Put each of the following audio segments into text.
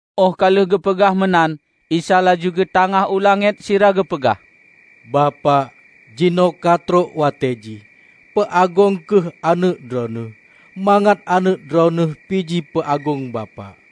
Óh ka lheueh geupeugah meunan, Isa laju geutangáh u langét sira geupeugah, "Bapak, jinoe ka trok watée jih. Peu Agong kheueh Aneuëk Droeneueh, mangat Aneuëk Droeneueh pi ji peu Agong Bapak.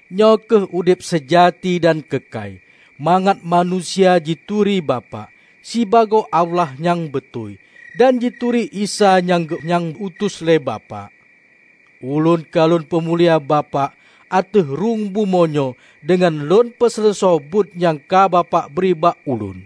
Nyoe kheueh Udeb seujati dan keukai; mangat manusia jituri Bapak, sibagoe Allah nyang beutôi, dan jituri Isa nyang nyang geu-utus lé Bapak. Ulôn ka lôn peumulia Bapak ateueh rhueng bumoe nyoe deungon lôn peuseuleusoe buet nyang ka Bapak bri bak Ulôn.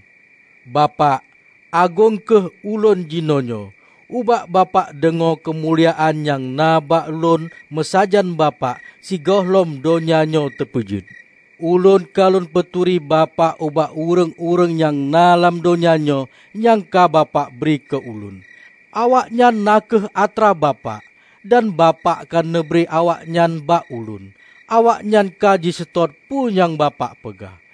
Bapak! Agong kheueh Ulôn jinoenyoe ubak Bapak deungoe keumuliaan nyang na bak Ulôn meusajan Bapak sigohlom donya nyoe teupeujeuet. Ulôn ka Lôn peuturi Bapak ubak ureuëng-ureuëng nyang na lam donya nyoe nyang ka Bapak bri keu Ulôn. Awaknyan na kheueh atra Bapak, dan Bapak ka neubri awaknyan bak Ulôn. Awaknyan ka jiseutôt peue nyang Bapak peugah.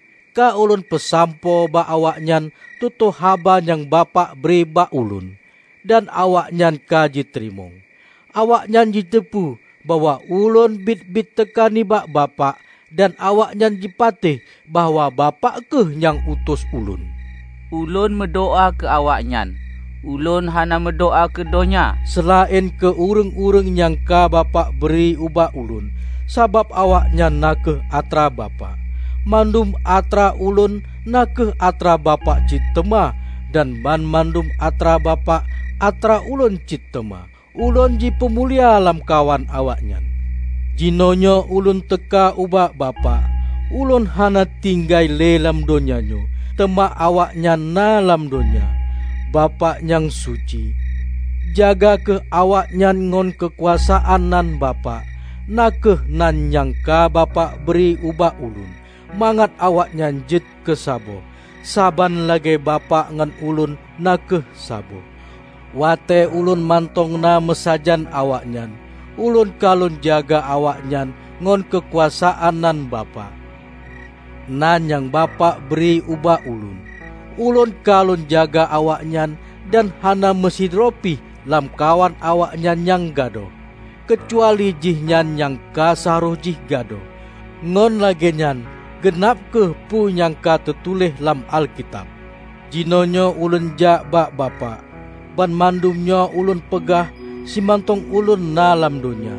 Ka Ulôn peusampoe bak awaknyan tutoe haba nyang Bapak bri bak Ulôn; dan awaknyan ka jiteurimong. Awaknyan jiteupeue bahwa Ulôn biet-biet teuka nibak Bapak dan awaknyan jipatéh bahwa Bapak kheueh nyang utus Ulôn. Ulôn meudoá keu awaknyan. Ulôn hana meudoá keu donya seulaén keu ureuëng-ureuëng nyang ka Bapak bri ubak Ulôn, sabab awaknyan na kheueh atra Bapak. Mandum atra Ulôn na kheueh atra Bapak cit teuma; dan banmandum atra Bapak atra Ulôn cit teuma. Ulôn jipeumulia lam kawan awaknyan. Jinoenyoe Ulôn teuka ubak Bapak. Ulôn hana tinggai le lam donya nyoe; teuma awaknyan na lam donya. Bapak nyang Suci! Jaga kheueh awaknyan ngon keukuasaan nan Bapak, na kheueh nan nyang ka Bapak bri ubak Ulôn -- mangat awaknyan jeuet keusaboh, saban lagée Bapak ngon Ulôn na kheueh saboh. Watée Ulôn mantong na meusajan awaknyan, Ulôn ka Lôn jaga awaknyan ngon keukuasaan nan Bapak -- nan nyang Bapak bri ubak Ulôn. Ulôn ka Lôn jaga awaknyan dan hana meusidroe pih lam kawan awaknyan nyang gadôh, keucuali jihnyan nyang ka seuharôh jih gadôh; ngon lagée nyan geunab kheueh peue nyang ka teutuléh lam Alkitab. Jinoenyoe Ulôn jak bak Bapak. Banmandum nyoe Ulôn peugah simantong Ulôn na lam donya;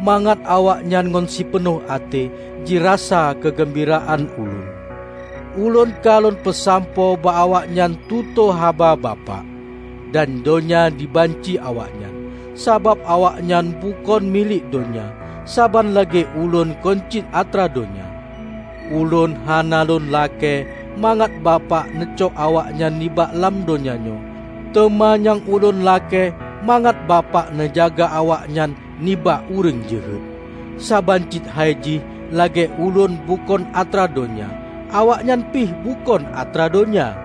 mangat awaknyan ngon sipeunoh até jirasa keugeumbiraan Ulôn. Ulôn ka Lôn peusampoe bak awaknyan tutoe haba Bapak, dan donya jibanci awaknyan, sabab awaknyan bukon milék donya, saban lagée Ulôn kon cit atra donya. Ulôn hana Lôn lakée mangat Bapak neucok awaknyan nibak lam donya nyoe, teuma nyang Ulôn lakée mangat Bapak neujaga awaknyan nibak ureuëng jeuhet. Saban cit hai jih lagée Ulôn bukon atra donya, awaknyan pih bukon atra donya.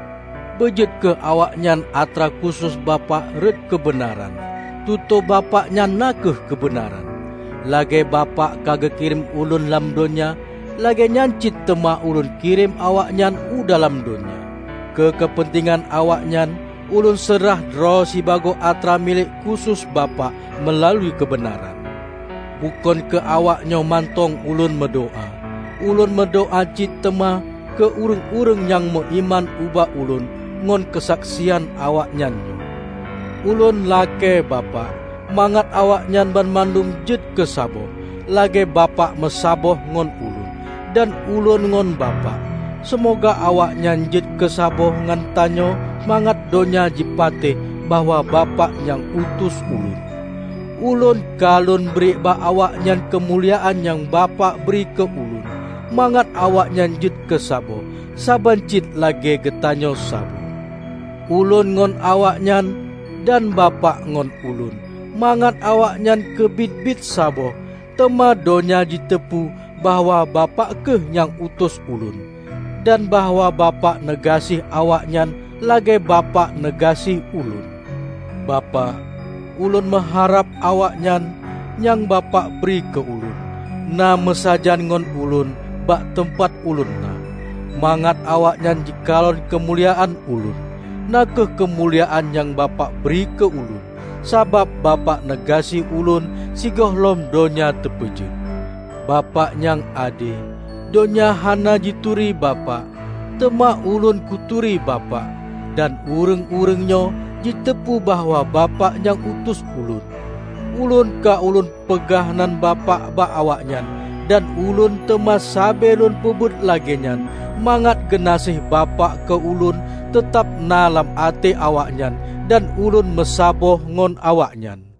Beujeuet kheueh awaknyan atra khusos Bapak rot keubeunaran; Tutoe Bapak nyan na kheueh keubeunaran. Lagée Bapak ka geukirém Ulôn lam donya, lagéenyan cit teuma Ulôn kirém awaknyan u dalam donya. Keu keupeuntengan awaknyan, Ulôn seurah droe sibagoe atra milék khusos Bapak meulalu keubeunaran. Bukon keu awaknyoe mantong Ulôn meudoá. Ulôn meudoá cit teuma keu ureuëng-ureuëng nyang meuiman ubak ulôn ngon keusaksian awaknyan nyoe. Ulôn lakée, Bapak, mangat awaknyan banmandum jeuet keu saboh, lagée Bapak meusaboh ngon Ulôn, dan Ulôn ngon Bapak. Seumoga awaknyan jeuet keu saboh ngon tanyoe mangat donya jipatéh bahwa Bapak nyang utus Ulôn. Ulôn ka Lôn bri bak awaknyan keumuliaan nyang Bapak bri keu Ulôn, mangat awaknyan jeuet keusaboh, saban cit lagée geutanyoe saboh; Ulôn ngon awaknyan, dan Bapak ngon Ulôn; mangat awaknyan keubiet-keubiet saboh. Teuma donya jiteupeue bahwa Bapak kheueh nyang utus Ulôn, dan bahwa Bapak neugaséh awaknyan lagée Bapak neugaséh Ulôn. Bapak, Ulôn meuharab awaknyan, nyang Bapak bri keu Ulôn, na meusajan ngon Ulôn bak teumpat Ulôn na, mangat awaknyan jikalon keumuliaan Ulôn; na kheueh keumuliaan nyang Bapak bri keu Ulôn, sabab Bapak neugaséh Ulôn sigohlom donya teupeujeuet. Bapak nyang ade! Donya hana jituri Bapak, teuma Ulôn kuturi Bapak; dan ureuëng-ureuëng nyoe jiteupeue bahwa Bapak nyang utus Ulôn. Ulôn ka Ulôn peugah nan Bapak bak awaknyan; dan Ulôn teuma sabe Lôn peubuet lagée nyan, mangat geunaséh Bapak keu Ulôn teutab na lam até awaknyan dan Ulôn meusaboh ngon awaknyan."